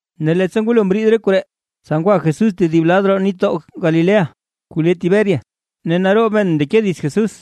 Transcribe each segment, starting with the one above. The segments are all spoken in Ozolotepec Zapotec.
Ne leettsa ngwalo mriid re koree, tsa ngwa Jesús tedib lad roo nitdoo Galilea, kuu le Tiberias. Ne naroob men mndeke dits Jesús,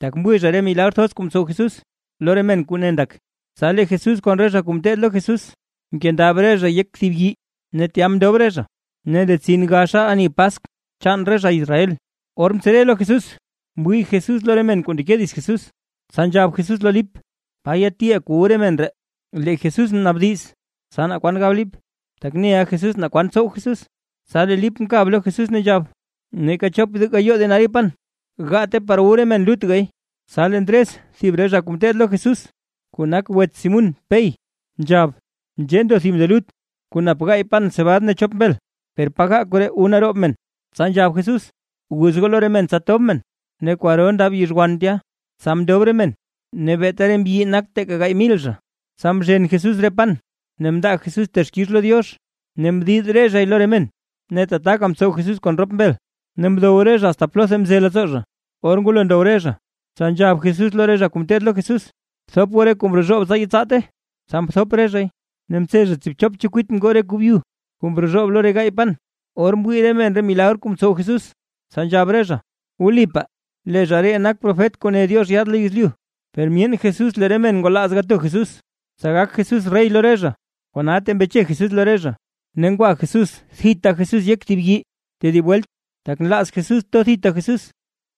tak mwii zha re milagr thoz kuu mtsow Jesús lo re men kuu ne ndak. Tsa lee Jesús kon re zha kuu ngeteed lo Jesús, mkendab re zha yek thib yii ne tya mndob re zha. Ne ndetsin gaxa ani Paskw chaan re zha Israel. Or mtsere lo Jesús mwii Jesús lo re men kuu ndeke dits Jesús, tsa nzhab Jesús lo Lip: ―¿Pa yatiʼaa kuu wu re men ree? Tenzhec mnaabdiz Jesús, tsa naa kwan gab Lip, tak neʼa Jesús naa kwan tsow Jesús. Tsa lee Lip mkab lo Jesús ne nzhab: ―Neeka chop gayoo denario pan, gaate par wu re men lutgay. Tsa lee Ndres thib re zha kuu ngeteed lo Jesús kuu nak wets Simún Pey, nzhab: ―Nzhee ndo thib nde lut kuu nap gaay pan cebad ne chop mbel; per pa ga koree wu naroob men. Tsa nzhab Jesús: ―Guz goo lo re men tsa tob men. Ne kwaro ndab yizhwan tya, tsa mndob re men ne beeta re mbyi nak teeka gaay mil zha. Tsa mzhen Jesús re pan, ne mndaa Jesús texkix lo Diox, ne mdid re zhay lo re men. Ne tataka mtsow Jesús kon rop mbel, ne mdow re zha asta plotha mze leettsoo zha. Or ngwalo ndow re zha, tsa nzhab Jesús lo re zha kuu ngeteed lo Jesús: ―Bthop goo re kuu mrozhoob, tsa yetsaate. Tsa mthop re zhay, ne mtse zha tsiibchop chekwit ngoo re kuu byu kuu mrozhoob lo re gaay pan. Or mwii re men re milagr kuu mtsow Jesús, tsa nzhab re zha: ―Wlipaa lee zha ree nak profet kuu ne Diox yaad lo yezlyu. Per myeen Jesús lee re men ngwalaaz to Jesús, tsa gak Jesús rey lo re zha, kona tee mbeche Jesús lo re zha, ne ngwa thita Jesús yek yii tedib welt, tak nlaaz Jesús to thita Jesús.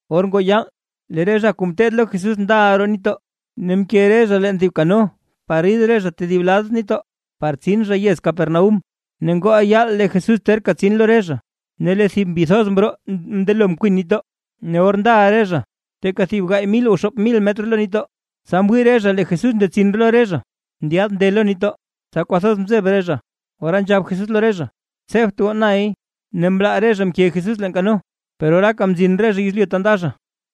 Or ngoo yaal, lee re zha kuu ngeteed lo Jesús ndala roo nitdoo, ne mke re zha leen thib kano par rid zha tedib lad nitdoo, par tsin zha yez Capernaúm. Ne ngooʼa yaal lee Jesús terka tsin lo re zha. Ne lee thib mbi thoz mroo mndelo mkwin nitdoo. Ne or ndaʼa re zha teeka thib gaay mil o xoop mil metr lo nitdoo, tsa mwii re zha lee Jesús ndetsin lo re zha ndyaad nde lo nitdoo, tsa kwathoz mzeb re zha. Ora nzhab Jesús lo re zha: ―¡Tsebt goo nay! Ne mlaa re zha mke Jesús leen kano, per oraaka mzin re zha yezlyu ta nda zha.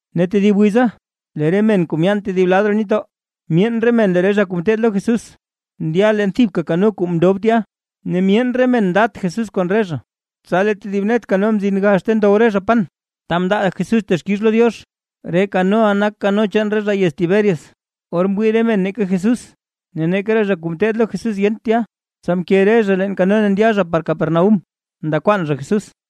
Ne tedib wiza, lee re men kuu myaan tedib lad roo nitdoo, myeen re men lee re zha kuu ngeteed lo Jesús ndya leen thibka kano kuu mndob tya, ne myeen re men ndat Jesús kon re zha. Tsa lee tedib net kano mzin gax ta ndow re zha pan, ta mndaa Jesús texkix lo Diox, re kanoʼa nak kano chaan re zha yez Tiberias. Or mwii re men neeka Jesús ne neeka re zha kuu ngeteed lo Jesús yenta tya, tsa mke re zha leen kano ne ndya zha par Capernaúm nda kwaan zha Jesús.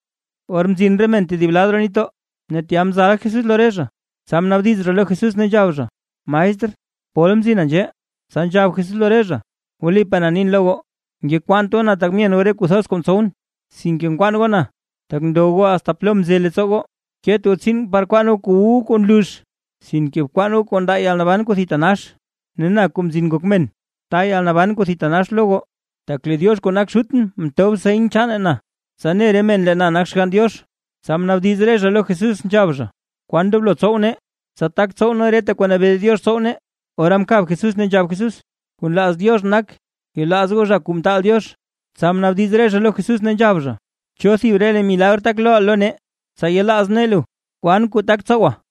Or mzin re men tedib lad roo nitdoo, ne tya mzal Jesús lo re zha, tsa mnaabdiz zha lo Jesús nzhab zha: ―Maestr, ¿pol mzina nzhee? Tsa nzhab Jesús lo re zha: ―Wlipaa na nin lo goo, ngekwaant goo na tak myen goo re kuu thoz kuu mtsowʼn, sinke nkwaan goo na, tak ndow goo asta plo mze leettsoo goo. Ket goo tsiin par kwaan goo kuu wu goo kuu nlux, sinke bkwaan goo kuu ndaa yalnaban kuu thitanax, ne na Kuu Mzin Ngok Men, ta yalnaban kuu thitanax lo goo, tak lee Diox kuu nak Xutʼn mtob seny chaane na, tsa ne re men lee na nak Xgann Diox. Tsa mnaabdiz re zha lo Jesús, nzhab zha: ―¿Kwan ndoblo tsow nee, tsa tak tsow nee reta kuu nabee Diox tsow nee? Ora mkab Jesús ne nzhab Jesús: ―Kuu nlaaz Diox nak, yelaaz goo zha kuu mtaal Diox. Tsa mnaabdiz re zha lo Jesús ne nzhab zha: ―¿Cho thib re milagr tak looʼa lo nee, tsa yelaaz nee lu? ¿Kwan kuu tak tsowa?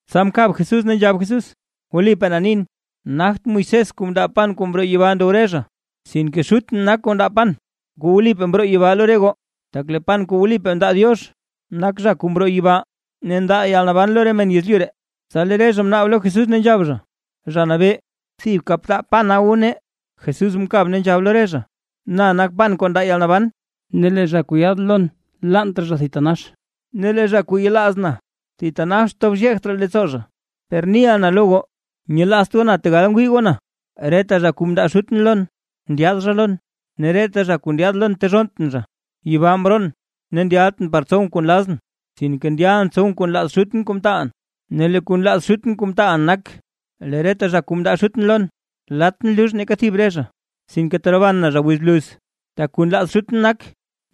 Tsa mkab Jesús ne nzhab Jesús: ―Wlipaa na nin, nagt Moisés kuu mndaa pan kuu mroo yibaa ndow goo, sinke Xutʼn nak kuu ndaa pan kuu wlipaa mroo yibaa lo re goo. Tak lee pan kuu wlipaa ndaa Diox, nak zha kuu mroo yibaa, ne ndaa yalnaban lo re men yezlyu ree. Tsa lee re zha mnaab lo Jesús ne nzhab zha: ―Zha Nabee, thibka btaa pana wu nee. Jesús mkab ne nzhab lo re zha: ―Na nak pan kuu ndaa yalnaban. Ne lee zha kuu yaad lon thitanax laant raa zha, ne lee zha kuu yelaaz na thitanax naa tob xyeekt raa leettsoo zha. Per niʼa na lo goo, nyelaazt goo na tegal ngwii goo na. Reta zha kuu mndaa Xutʼn lon, ndyaad zha lon, ne reta zha kuu ndyaad lon, tezhonntʼn zha. Yibaa mroon ne ndyaltʼn par tsowʼn kuu nlazʼn, sinke ndyalʼn tsowʼn kuu nlaaz Xutʼn kuu mtaalʼn. Ne lee kuu nlaaz Xutʼn kuu mtaalʼn nak, lee reta zha kuu mndaa Xutʼn lon, latʼn lux neeka thib re zha, sinke teroban na zha wiz bluz. Tak kuu nlaaz Xutʼn nak,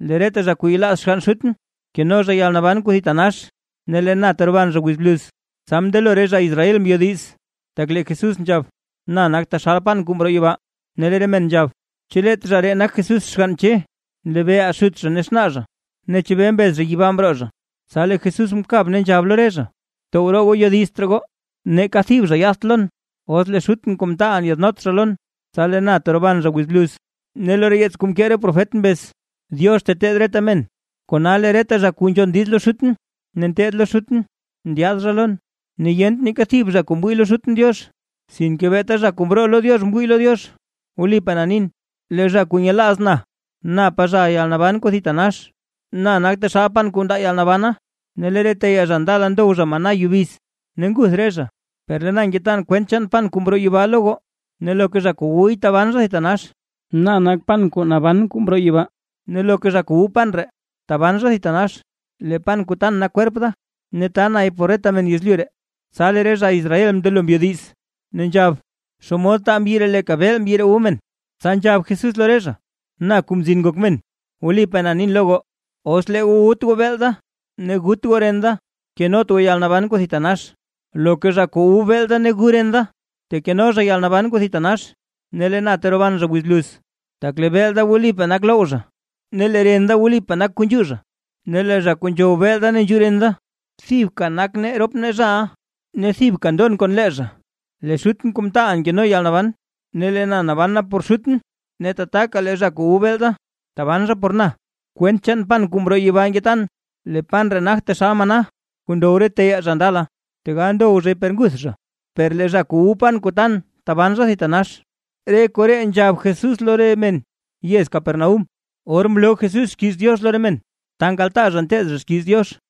lee reta zha kuu yelaaz xgann Xutʼn, keno zha yalnaban kuu thitanax ne lee na teroban zha wiz bluz. Tsa mndelo re zha Israel mbyodiz, tak lee Jesús nzhab: “Na nak taxal pan kuu mroo yibaa”. Ne lee re men nzhab: ―¿Chu leet zha ree nak Jesús xgann Che? Nlebeeʼaa xut zha ne xnaa zha. Ne ¿chebee mbez zha yibaa mroo zha? Tsa lee Jesús mkab ne nzhab lo re zha: ―Tow roo goo yodizt raa goo. Neeka thib zha yaadt lon, os lee Xutʼn kuu mtaalʼn yaadnot zha lon, tsa lee na teroban zha wiz bluz. Ne lo yeets kuu mkee re profet mbez: “Diox teteed reta men”. Kona lee reta zha kuu nzhon diiz lo Xutʼn ne nteed lo Xutʼn, ndyaad zha lon. ’Ne yent neeka thib zha kuu mwii lo Xutʼn Diox, sinke beeta zha kuu mroo lo Diox mwii lo Diox. Wlipaa na nin, lee zha kuu nyelaaz na napa zhaʼa yalnaban kuu thitanax. Na nak taxal pan kuu ndaa yalnabana. Lee re teyaa zha ndala ndow zha maná yubiz, ne nguth re zha. Per lee na ngetan kwent chaan pan kuu mroo yibaa lo goo, ne loka zha kuu wuy taban zha thitanax. Na nak pan kuu naban kuu mroo yibaa, ne loka zha kuu wu pan ree taban zha thitanax. Lee pan kuu tan nak kwerp da, ne ta nay por reta men yezlyu ree. Tsa lee re zha Israel mndelo mbyodiz, ne nzhab: ―¿Xomod taa mbyi ree leeka beel mbyi ree wu men? Tsa nzhab Jesús lo re zha: ―Na Kuu Mzin Ngok Men. Wlipaa na nin lo goo, os lee goo wut goo beel da, ne gut goo ren da kenot goo yalnaban kuu thitanax. Loka zha kuu wu beel da ne gu ren da, tekeno zha yalnaban kuu thitanax, ne lee na teroban zha wiz bluz. Tak lee beel da wlipaa nak loww zha, ne lee ren da wlipaa nak kuu nzhuu zha. Ne lee zha kuu nzhow beel da ne nzhuu ren da, thibka nak nee rop nee zhaʼa ne thibka ndon kon lee zha. Lee Xutʼn kuu mtaalʼn nkeno yalnaban, ne lee na naban na por Xutʼn; ne tataka lee zha kuu wu beel da taban zha por na. Kwent chaan pan kuu mroo yibaa ngetan. Lee pan ree nagt taxal maná kuu ndow re teyaa zha ndala, tegal ndow zhay per nguth zha, per lee zha kuu wu pan kuu tan taban zha thitanax. Re koree nzhab Jesús lo re men yez Capernaúm, or mloo Jesús xkiiz Diox lo re men ta nkaltaa zha nteed zha xkiiz Diox.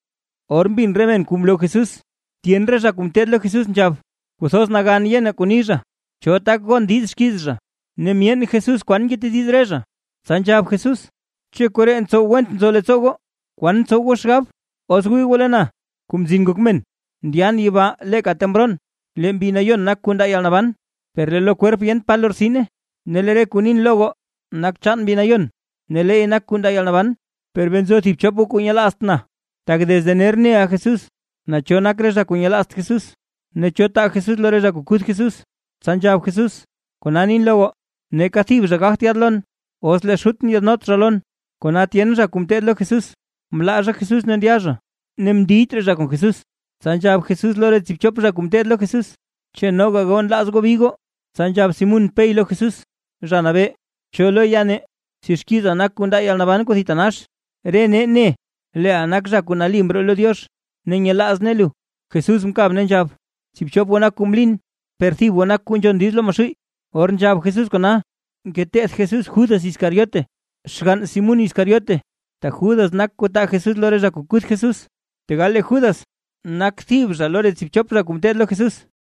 Or mbin re men re kuu mloo Jesús, tyen re zha kuu ngeteed lo Jesús nzhab: ―Kwathoz nagan yenaa kuu ni zha; ¿cho tak gon diiz xkiiz zha? Ne myeen Jesús kwan ngetediz re zha, tsa nzhab Jesús: ―Cho koree ntsow went nzo leettsoo goo. ¿Kwan tsow goo xgab, os wii goo lee na, Kuu Mzin Ngok Men, ndyan yibaa leeka ta mroon? Lee Mbi Nayon nak kuu ndaa yalnaban, per lee lo kwerp yent pa lortsine. Ne lee re kuu nin lo goo nak chaan Mbi Nayon ne leey nak kuu ndaa yalnaban. Per bee nzo thib chop goo kuu nyelaazt na. Tak desde ner neʼa Jesús, naa cho nak re zha kuu nyelaazt Jesús, ne cho taa Jesús lo re zha kuu kuth Jesús. Tsa nzhab Jesús: ―Kona nin lo goo, neeka thib zha gagt yaad lon, os lee Xutʼn yaadnot zha lon. Kona tyen zha kuu ngeteed lo Jesús, mlaa zha Jesús ne ndya zha, ne mndiyt raa zha kon Jesús. Tsa nzhab Jesús lo re tsiibchop zha kuu ngeteed lo Jesús: ―¿Chu noga goo nlaaz goo bi goo? Tsa nzhab Simún Pey lo Jesús: ―Zha Nabee, ¿cho lo ya nee? Si xkiiza nak kuu ndaa yalnaban kuu thitanax. Re nee ne leeʼa nak Zha Nali kuu mroo lo Diox, ne nyelaaz nee lu. Jesús mkab ne nzhab: ―Tsiibchop goo nak zha kuu mlin, per thib goo nak kuu nzhon diiz lo Maxuuy. Or nzhab Jesús kona ngeteth Jesús Judas Iscariote, xgann Simún Iscariote, tak Judas nak kuu taa Jesús lo re zha kuu kuth Jesús, tegal lee Judas nak thib zha lo re tsiibchop zha kuu ngeteed lo Jesús.